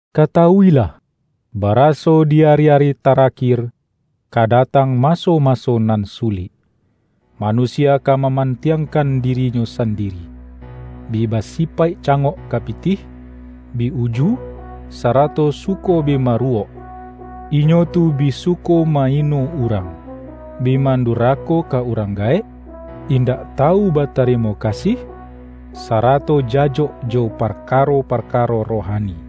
Katawu-ilah, baraso di ari-ari tara-kir ka datang maso-maso nan su-lik. Manusia ka mamantiangkan di-rinyo sandiri, bi basipaik cangok ka pitih, bi uju, sarato suko bi maruwok. Inyo tu bi suko ma-ino urang, bi man-durako ka urang gaek, indak tawu ba-tarimo kasih, sarato jajok jo parka-ro-parkaro rohani.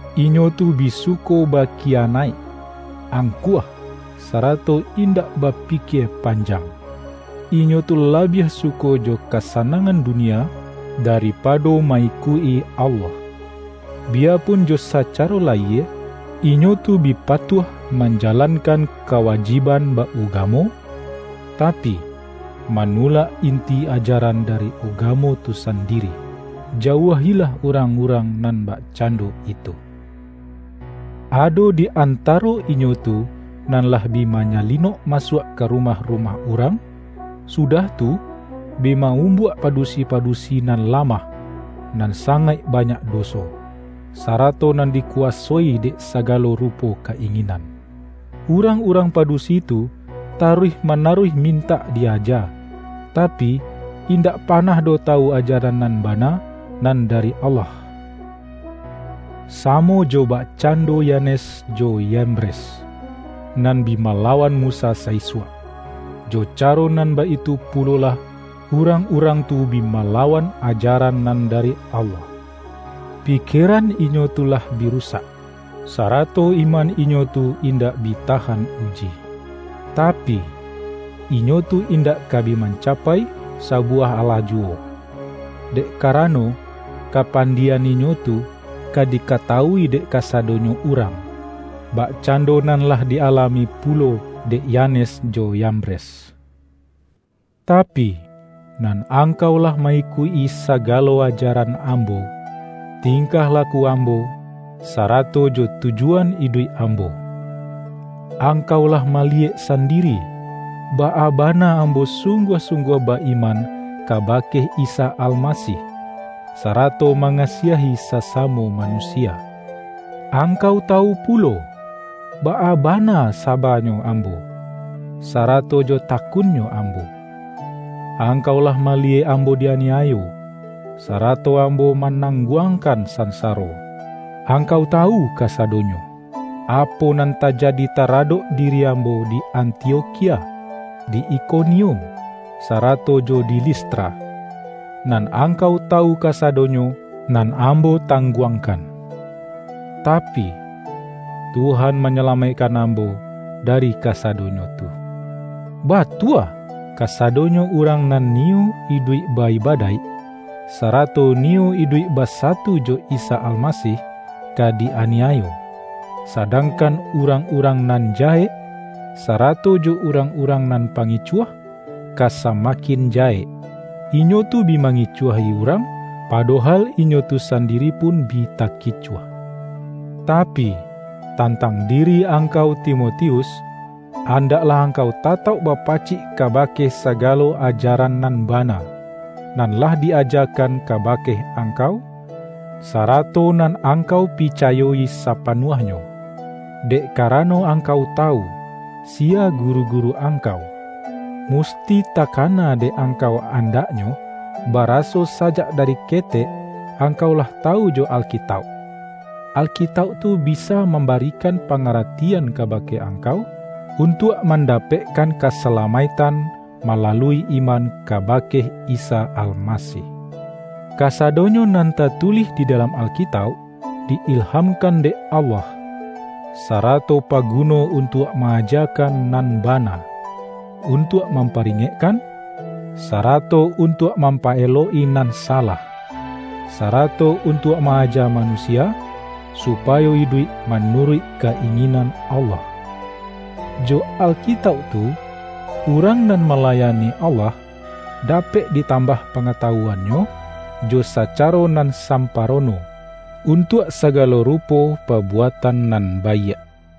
Inyo tu bi suko ba-kiyanaik, angkuah, sarato indak ba-pikie panjang. Inyo tu labiah suko jo kasanangan dunia daripado ma-ikuik-i Allah. Biyapun jo sacaro layie, inyo tu bi patuah manjalankan kawajib-an ba-ugamo, tapi, manulak inti aja-ran dari ugamo tu sandiri. Jauah-ilah urang-urang nan bakcando itu. Ado di antaro inyo tu nan lah bi manya-linok masuak ka rumah-rumah urang, sudah tu, bi ma-umbuak padusi-padusi nan lamah, nan sangaik banyak doso, sarato nan dikuwasoi dek sagalo rupo ka-inginan. Urang-urang padusi tu ta-ruih manaruih mintak di-aja, tapi, in-dak panah doh tawu ajaran nan bana nan dari Allah. Samo jo bakcando Ya-nes jo Yambres, nan bi malawan Mu-sa sa-isuak, jo caro nan baitu pulolah urang-urang tu bi malawan ajaran nan dari Allah. Pikieran inyo tu lah bi ru-sak, sarato iman inyo tu indak bi tahan uji. Tapi, inyo tu indak ka bi manca-pai sabuwah alah juwo, dek karano, kapandie-an inyo tu ka dikatawui dek kasadonyo urang, bakcando nan lah di-alami pulo dek Yanes jo Yambres. Tapi, nan angkau lah ma-ikuik-i sagalo ajaran ambo, tingkah laku am-bo, sarato jo tujuan iduik ambo. Ang-kau lah maliyek sandiri, baa bana ambo sungguah-sungguah ba-iman ka-bake Isa Almasih, sarato mangasiahi sasamo manusia. Angkau tawu pulo, baa bana saba-nyo ambo, sarato jo takun-nyo ambo. Angkau lah mali-yek ambo di-aniayo, sarato ambo ma-nangguangkan sansaro. Angkau tawu kasadonyo, apo nan tajadi taradok diri ambo di Antiokhia, di Ikonium, sara-to jo di Listra; nan angkau tawu kasa-donyo nan ambo tangguangkan! Tapi, Tuhan manyalamaikkan ambo da-ri kasadonyo tu. Batua, kasadonyo urang nan niyo iduik ba-ibadaik, sara-to niyo iduik basatu jo Isa Almasih, ka di-aniayo, sadangkan urang-urang nan jahek, sarato jo urang-urang nan pangicuah, ka samakin jahek. Inyo tu bi mangicuahi urang, padohal inyo tu sandiri pun bi takicuah. Tapi, tan-tang diri angkau Timotius, andaklah angkau tatauk bapacik kabake sagalo ajaran nan bana, nan lah di-ajakan ka-bake angkau, sarato nan angkau pica-yo-i sapanuahnyo; dek karano angkau tawu, siya guru-guru angkau. Mus-ti takana dek angkau andaknyo, bara-so sajak dari ketek angkau lah tawu jo Alkitauk. Alkitauk tu bisa mam-barikan pangaratian kabake angkau, untuak mandapekkan kasalamaik-tan malalui iman kabake Isa Almasih. Kasadonyo nan tatulih di dalam Alkitauk, di-ilhamkan dek Allah, sa-rato paguno untuak ma-ajakan nan bana, untuak mamparingekkan, sa-rato untuak mampa-elok-i nan salah, sarato untuak ma-aja manusia, supa-yo iduik manuruik ka-inginan Allah. Jo Alkitauk tu, urang nan malayani Allah, dapek ditambah pangatawuan-nyo jo sacaro nan samparono, untuak sagalo rupo pabuatan nan baiak.